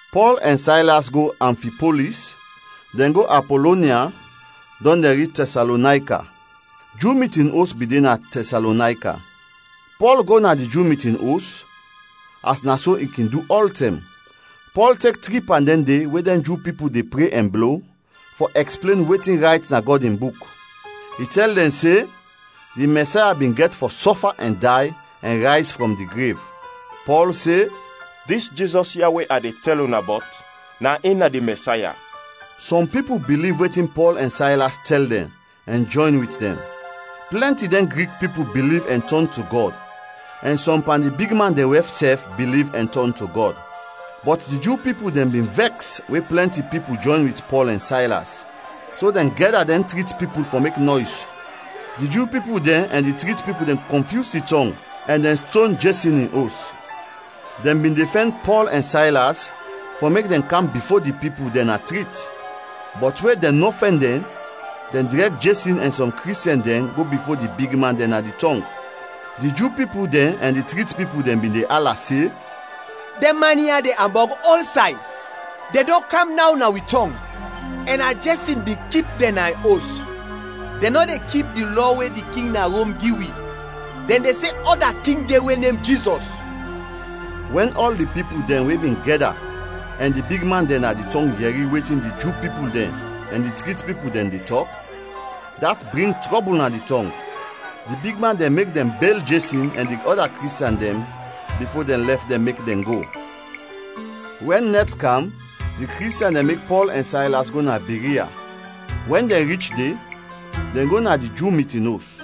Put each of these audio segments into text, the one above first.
Pɔl ɛn Saylas go Amfipolis, dɛn go Apolonia, dɔn dɛn rich Tɛsalonayka. Ju mitin os bin de na Tɛsalonayka. Pɔl go na di Ju mitin os, as na so i kin du ɔltɛm. Pɔl tek tri pan dɛn de we dɛn Ju pipul de pre ɛn blo, fɔ ɛksplen wetin rayt na Gɔd in Buk. I tɛl dɛn se di Mɛsaya bin gɛt fɔ sɔfa ɛn day ɛn rayz frɔm di grev. Pɔl se, “Dis Jizɔs ya we a de tɛl una bɔt na in na di Mɛsaya.” Sɔm pipul biliv wetin Pɔl ɛn Saylas tɛl dɛn ɛn jɔyn wit dɛn. Plɛnti dɛn Grik pipul biliv ɛn tɔn to Gɔd, ɛn sɔm pan di bigman dɛn wɛf sɛf biliv ɛn tɔn to Gɔd. Bɔt di Ju pipul dɛn bin vɛks we plɛnti pipul jɔyn wit Pɔl ɛn Saylas, so dɛn gɛda dɛn trit pipul fɔ mek nɔys. Di Ju pipul dɛn ɛn di trit pipul dɛn kɔnfyus di tɔng ɛn dɛn ston Jesɔn in os. Dɛn bin de fɛn Pɔl ɛn Saylas fɔ mek dɛn kam bifo di pipul dɛn na trit. Bɔt we dɛn nɔ fɛn dɛn, dɛn drɛg Jesɔn ɛn sɔm Kristiɛn dɛn go bifo di bigman dɛn na di tɔng. Di Ju pipul dɛn ɛn di trit pipul dɛn bin de ala se, “Dɛn man ya de ambɔg ɔlsay! Dɛn dɔn kam naw na wi tɔng, ɛn na Jesɔn bin kip dɛn na in os. Dɛn nɔ de kip di lɔ we di king na Rom gi wi, dɛn de se ɔda king de we nem Jizɔs.” Wɛn ɔl di pipul dɛn we bin gɛda ɛn di bigman dɛn na di tɔng yɛri wetin di Ju pipul dɛn ɛn di trit pipul dɛn de tɔk, dat bring trɔbul na di tɔng. Di bigman dɛn mek dɛn bel Jesɔn ɛn di ɔda Kristiɛn dɛn bifo dɛn lɛf dɛn mek dɛn go. Wɛn nɛt kam, di Kristiɛn dɛn mek Pɔl ɛn Saylas go na Biria. Wɛn dɛn rich de, dɛn go na di Ju mitin os.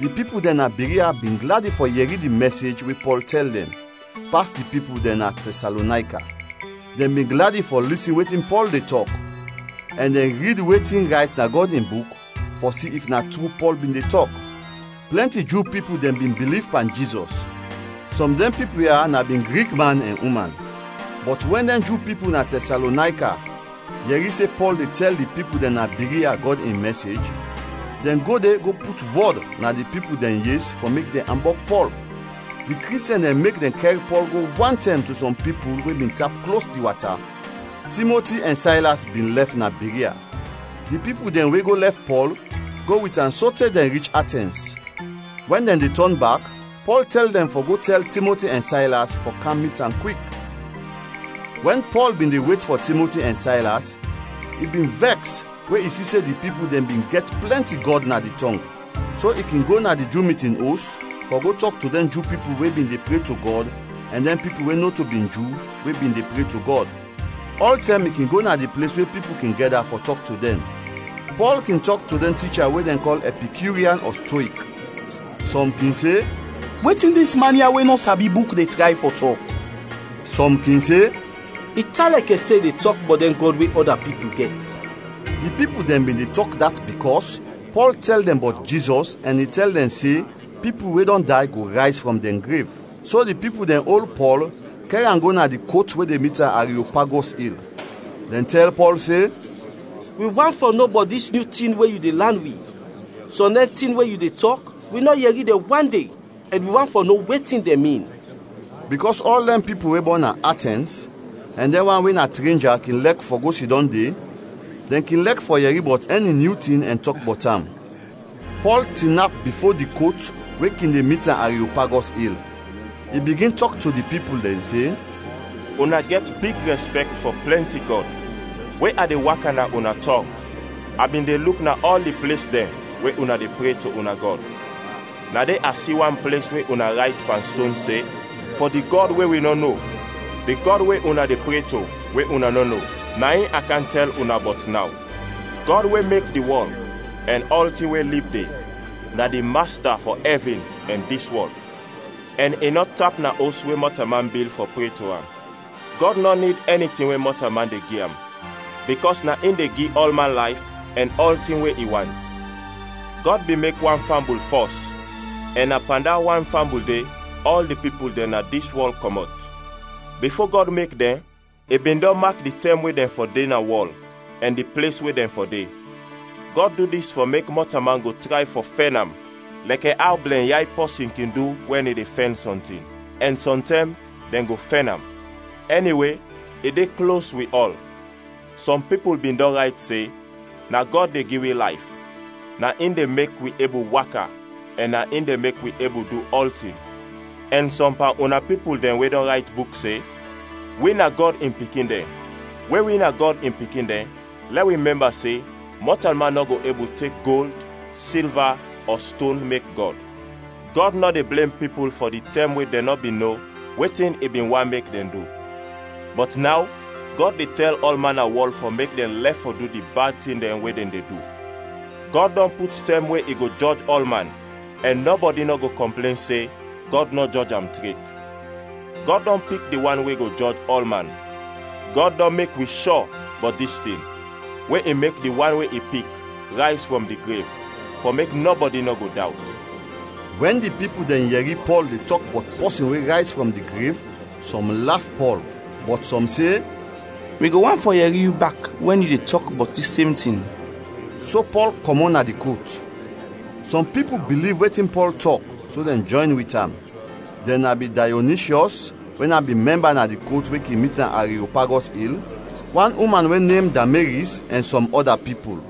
Di pipul dɛn na Biria bin gladi fɔ yɛri di mɛsej we Pɔl tɛl dɛn, pas di pipul dɛn na Tɛsalonayka. Dɛn bin gladi fɔ lisin wetin Pɔl de tɔk, ɛn dɛn rid wetin rayt na Gɔd in Buk fɔ si if na tru Pɔl bin de tɔk. Plɛnti Ju pipul dɛn bin biliv pan Jizɔs; sɔm dɛn pipul ya na bin Grik, man ɛn uman. Bɔt wɛn dɛn Ju pipul na Tɛsalonayka yɛri se Pɔl de tɛl di pipul dɛn na Biria Gɔd in mɛsej, dɛn go de go put wɔd na di pipul dɛn yes fɔ mek dɛn ambɔg Pɔl. Di Kristiɛn dɛn mek dɛn kɛr Pɔl go wantɛm to sɔm pipul we bin tap klos di wata. Timoti ɛn Saylas bin lɛf na Biria. Di pipul dɛn we go lɛf Pɔl, go wit am sote dɛn rich Atɛns. Wɛn dɛn de tɔn bak, Pɔl tɛl dɛn fɔ go tɛl Timoti ɛn Saylas fɔ kam mit am kwik. Wɛn Pɔl bin de wet fɔ Timoti ɛn Saylas, i bin vɛks we i si se di pipul dɛn bin gɛt plɛnti gɔd na di tɔng. So i kin go na di Ju mitin os fɔ go tɔk to dɛn Ju pipul we bin de pre to Gɔd ɛn dɛn pipul we nɔto bin Ju we bin de pre to Gɔd. Ɔltɛm i kin go na di ples we pipul kin gɛda fɔ tɔk to dɛn. Pɔl kin tɔk to dɛn ticha we dɛn kɔl Ɛpikyurian ɔ Stoik. Sɔm kin se, “Wetin dis man ya we nɔ sabi buk de tray fɔ tɔk?” Sɔm kin se, “I tan lɛkɛ se i de tɔk bɔt dɛn gɔd we ɔda pipul gɛt.” Di pipul dɛn bin de tɔk dat bikɔs Pɔl tɛl dɛn bɔt Jizɔs ɛn i tɛl dɛn se pipul we dɔn day go rayz frɔm dɛn grev. So di pipul dɛn ol Pɔl kɛr am go na di kot we de mit na Ariopagɔs il. Dɛn tɛl Pɔl se, “Wi want fɔ no bɔt dis nyu tin we yu de lan wi. Sɔm dɛn tin we yu de tɔk, wi nɔ yɛri dɛn wande ɛn wi want fɔ no wetin dɛn min.” Bikɔs ɔl dɛn pipul we bɔn na Atɛns ɛn dɛn wan we na trenja kin lɛk fɔ go sidɔm de, dɛn kin lɛk fɔ yɛri bɔt ɛni nyu tin ɛn tɔk bɔt am. Pɔl tinap bifo di kot we kin de mit na Ariopagɔs il. I bigin tɔk to di pipul dɛn se, “Una gɛt big rɛspɛkt fɔ plɛnti gɔd. We a de waka na una tɔng, a bin de luk na ɔl di ples dɛn we una de pre to una gɔd; na de a si wan ples we una rayt pan ston se, ‘Fɔ di gɔd we wi nɔ no’. Di gɔd we una de pre to, we una nɔ no, na in a kam tɛl una bɔt naw. Gɔd we mek di wɔl ɛn ɔltin we lib de, na di Masta fɔ ɛvin ɛn dis wɔl, ɛn i nɔ tap na os we mɔtalman bil fɔ pre to am. Gɔd nɔ nid ɛni tin we mɔtalman de gi am bikɔs na in de gi ɔlman layf ɛn ɔltin we i want. Gɔd bin mek wan fambul fɔs ɛn na pan da wan fambul de, ɔl di pipul dɛn na dis wɔl kɔmɔt. Bifo Gɔd mek dɛn, i bin dɔn mak di tɛm we dɛn fɔ de na wɔl ɛn di ples we dɛn fɔ de. Gɔd du dis fɔ mek mɔtalman go tray fɔ fɛn am lɛkɛ aw blɛnyay pɔsin kin du wɛn i de fɛn sɔntin, ɛn sɔntɛm dɛn go fɛn am. Ɛniwe i de klos wi ɔl; sɔm pipul bin dɔn rayt se, ‘Na Gɔd de gi wi layf, na in de mek wi ebul waka ɛn na in de mek wi ebul du ɔltin!’ Ɛn sɔm pan una pipul dɛn we dɔn rayt buk, se, ‘Wi na Gɔd in pikin dɛn.’ We wi na Gɔd in pikin dɛn, lɛ wi mɛmba se mɔtalman nɔ go ebul tek gold, silva, ɔ ston mek Gɔd. Gɔd nɔ de blem pipul fɔ di tɛm we dɛn nɔ bin no wetin i bin want mek dɛn du; bɔt naw Gɔd de tɛl ɔlman na wɔl fɔ mek dɛn lɛf fɔ du di bad tin dɛn we dɛn de du. Gɔd dɔn put tɛm we i go jɔj ɔlman ɛn nɔbɔdi nɔ go kɔmplen se Gɔd nɔ jɔj am tret. Gɔd dɔn pik di wan we go jɔj ɔlman. Gɔd dɔn mek wi shɔ bɔt dis tin, we i mek di wan we i pik, rayz frɔm di grev, fɔ mek nɔbɔdi nɔ go dawt.” Wɛn di pipul dɛn yɛri Pɔl de tɔk bɔt pɔsin we rayz frɔm di grev, sɔm laf Pɔl, bɔt sɔm se, “Wi go want fɔ yɛri yu bak wɛn yu de tɔk bɔt dis sem tin.” So Pɔl kɔmɔt na di kot. Sɔm pipul biliv wetin Pɔl tɔk so dɛn jɔyn wit am. Dɛn na bin Dayonishyɔs we na bin mɛmba na di kot we kin mit na Ariopagɔs il, wan uman we nem Damaris, ɛn sɔm ɔda pipul.